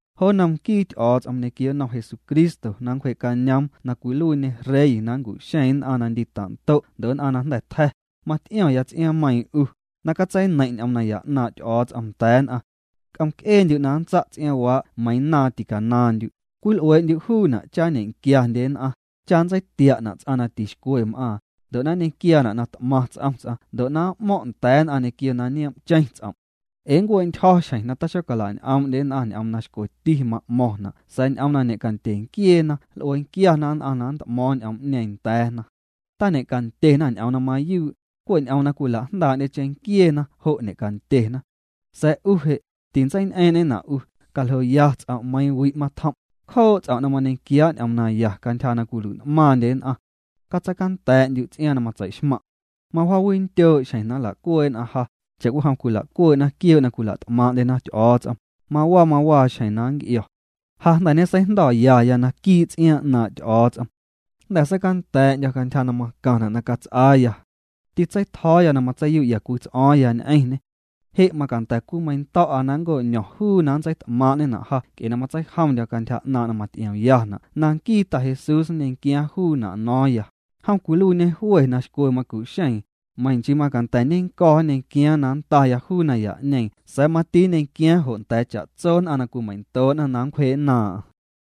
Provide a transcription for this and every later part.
Jo nnom nquii Ty'o̱o̱ts'om ñequio nnom Jesucristo na nncwjee'cañoom na cwiluiiñê rey na nncu'xeeⁿ nn'aⁿ na nndita'ndo' ndo' nn'aⁿ na jnda̱ tja̱, mat'io̱ⁿya ts'iaaⁿmeiiⁿ 'u, na catseineiⁿ' ñ'oom naya 'naaⁿ' Ty'o̱o̱ts'om nda̱a̱ nn'aⁿ. C'omc'eendyu' na nntsa' ts'iaaⁿwaa' meiiⁿ naaⁿ ticanaaⁿndyu', cwil'uee'ndyu' juuna' cha nñe'quiandye nn'aⁿ, cha nntseitia'na' ts'aⁿ na tixcwe m'aaⁿ, ndo' na nñequiaana' na t'maⁿ ts'om ts'aⁿ ndo' na m'mo̱ⁿ' nda̱a̱ nn'aⁿ ñequio na nioom'cheⁿ ts'om'. Ee nncue'ntyjo̱ xjeⁿ na taxola'ñ'oom'ndye nn'aⁿ ñ'oom na xcweti ma'mo̱ⁿna' sa̱a̱ ñ'oom na ñe'candye nquieena nl'uee nquiana nn'aⁿ na nt'mo̱o̱ⁿ ñ'oom'ñeeⁿ nda̱a̱na. Tañe'candyena ñ'oom na mayuu', cwe' ñ'oom na cwila'jndaa'ndye cheⁿnquieena jo' ñe'candyena. Sa̱a̱ 'u je', tintseiñ'eeⁿ'ñena' 'u, caljoya ts'om' meiiⁿ wi' na matjom', cjoo' ts'om na mañequiaa' ñ'oom naya na cantyja 'naaⁿ' jo' cwilui'n'maaⁿndye nn'aⁿ. Catseicanda̱a̱'ndyu' ts'iaaⁿ na matseixmaⁿ'. Mawjaawindyoo' xjeⁿ na nla'cuee' nn'aⁿ ja, cha'cwijom cwila'cuee'na quioo' na cwila't'maaⁿ'ndyena Ty'o̱o̱ts'om, mawaa mawaa xjeⁿ na nnc'io̱. Ja jnda̱ ñeseijndo̱yaya naquii' ts'iaaⁿ 'naaⁿ' Ty'o̱o̱ts'om. Jnda̱ seicanda̱a̱'ndyo̱ cantyja na macaⁿna' na cats'aaya. Tîcatseitjo̱o̱ya na matseiyu'ya cwii ts'o̱o̱ⁿya ñ'eⁿñê. Je' macanda̱ cwimeiⁿndo̱'a na nco'ño̱ⁿya juu na nntseit'maaⁿ'ñena' ja nc'e na matseijomndyo̱ cantyja 'naaⁿ' na maty'iomyana' na nquii Ta Jesús nñequiaaⁿ juuna' no̱o̱ⁿya, jom cwiluiiñê jwe na xcwe macu'xeeⁿ, meiⁿ nchii macanda̱ nennco̱ nñequiaaⁿ na nndaya juu naya'ñeeⁿ sa̱a̱ mati nñequiaaⁿ jo' nda̱a̱ cha'tso nn'aⁿ na cwimeiⁿndoo'na na nncwjee' nnaaⁿ'aⁿ.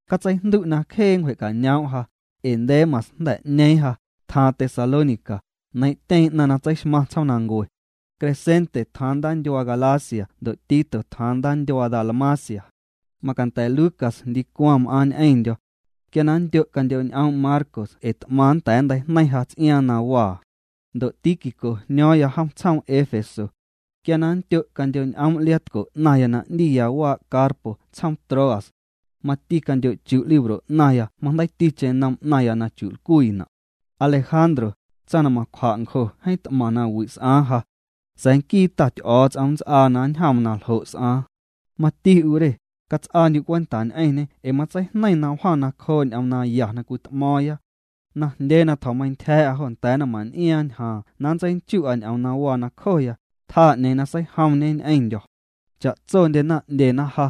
Catseijndu' na cjee nncwje'cañoom' ja, ee Demas jnda̱ 'ñeeⁿ ja, tjaaⁿ Tesalónica, neiiⁿ'tyeⁿ 'naⁿ na tseixmaⁿ tsjoomnancue. Crescente tjaaⁿ ndaandyuaa Galacia ndo' Tito tjaaⁿ ndaandyuaa Dalmacia. Macanda̱ Lucas ndicwaⁿ m'aaⁿ ñ'eⁿndyo̱. Quia nndyo' candyo'ñ'oom' Marcos ee t'maⁿ nnda̱a̱ nnteijneiⁿ ja ts'iaaⁿ na waa. Ndo' Tíquico jño̱o̱ⁿya jom tsjoom Efeso. Quia na nndyo' candyo'ñ'oom' liaatco 'naⁿya na 'ndiya waa' Carpo tsjoom Troas. Mati candyo'chu' libro 'naⁿya majndeiiticheⁿ nom 'naⁿya na chu'lcwiina'. Alejandro, tsaⁿ na macwja' ncjo jeeⁿ t'maⁿ nawi' s'aaⁿ ja. Sa̱a̱ nquii Ta Ty'o̱o̱ts'om nnts'aaⁿ na nnjoom na ljo' s'aaⁿ. Mati 'u re, cats'aandyu' cwenta ñ'eⁿñê ee matseijneiⁿ na wjaⁿ nacjoo' ñ'oom naya na cwit'mo̱o̱ⁿya. Najndyee na tjo̱meintyja̱a̱'a jo nda̱a̱ naⁿman'iaaⁿ ñjaaⁿ na ntseinchu'a ñ'oom na waa nacjoya, tjaa 'ñeeⁿ na seijomñe ñ'eⁿndyo̱. Cha'tsondyena 'ndyena ja.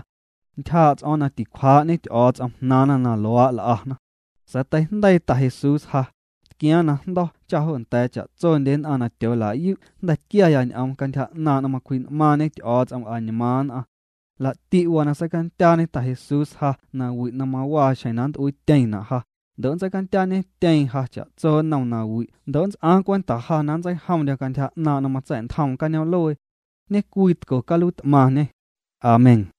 Ntyjaa' ts'o̱o̱ⁿ na ticwjaa'ñe Ty'o̱o̱ts'om jnaaⁿna na luaa' l'ana. Sa̱a̱ teijndeii Ta Jesús ja, tquiaaⁿ najndo̱ cha na jo nda̱a̱ cha'tsondye nn'aⁿ na tyoola'yu' jnda̱ tquiaya ñ'oom cantyja 'naaⁿ' na macwji'n'maaⁿñe Ty'o̱o̱ts'om añmaaⁿ nn'aⁿ. Laa'ti' waa na seicandyaañe Ta Jesús ja nawi' na mawaa xjeⁿna nnt'uiityeⁿna' ja, ndo' nntseicandyaañetyeeⁿ ja cha'tso nnom nawi' ndo' nnts'aaⁿ cwenta ja na nntseijomndyo̱ cantyja 'naaⁿ' na matsa̱'ntjoom cañoom'luee. Ñecwii tco caluiit'maⁿñê. Amén.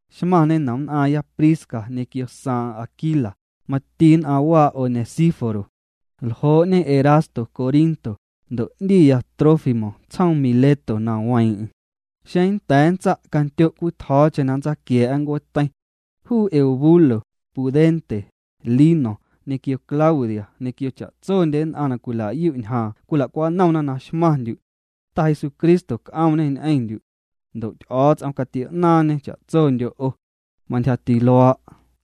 Xmaⁿñe nomnn'aaⁿya Prisca ñequio saaⁿ'aⁿ Aquila, mati nn'aⁿ waa' Onesíforo. Ljoo'ñe Erasto Corinto, ndo' 'ndiya Trófimo tsjoom Mileto na weeⁿ'eⁿ. Xeeⁿ nnda̱a̱ nntsa' candyo cwii tjo̱o̱cheⁿ na nntsaquia̱a̱'a ncueeteiⁿ. Juu Eubulo, Pudente, Lino, ñequio Claudia ñequio cha'tsondye nn'aⁿ na cwilayu' ñjaaⁿ cwila'cwanomna na xmaⁿndyu'. Ta Jesucristo c'oomñê ñ'eⁿndyu'. Ndo' Ty'o̱o̱ts'om catio'naaⁿñê cha'tsondyo' 'o. Mantyjati luaa'.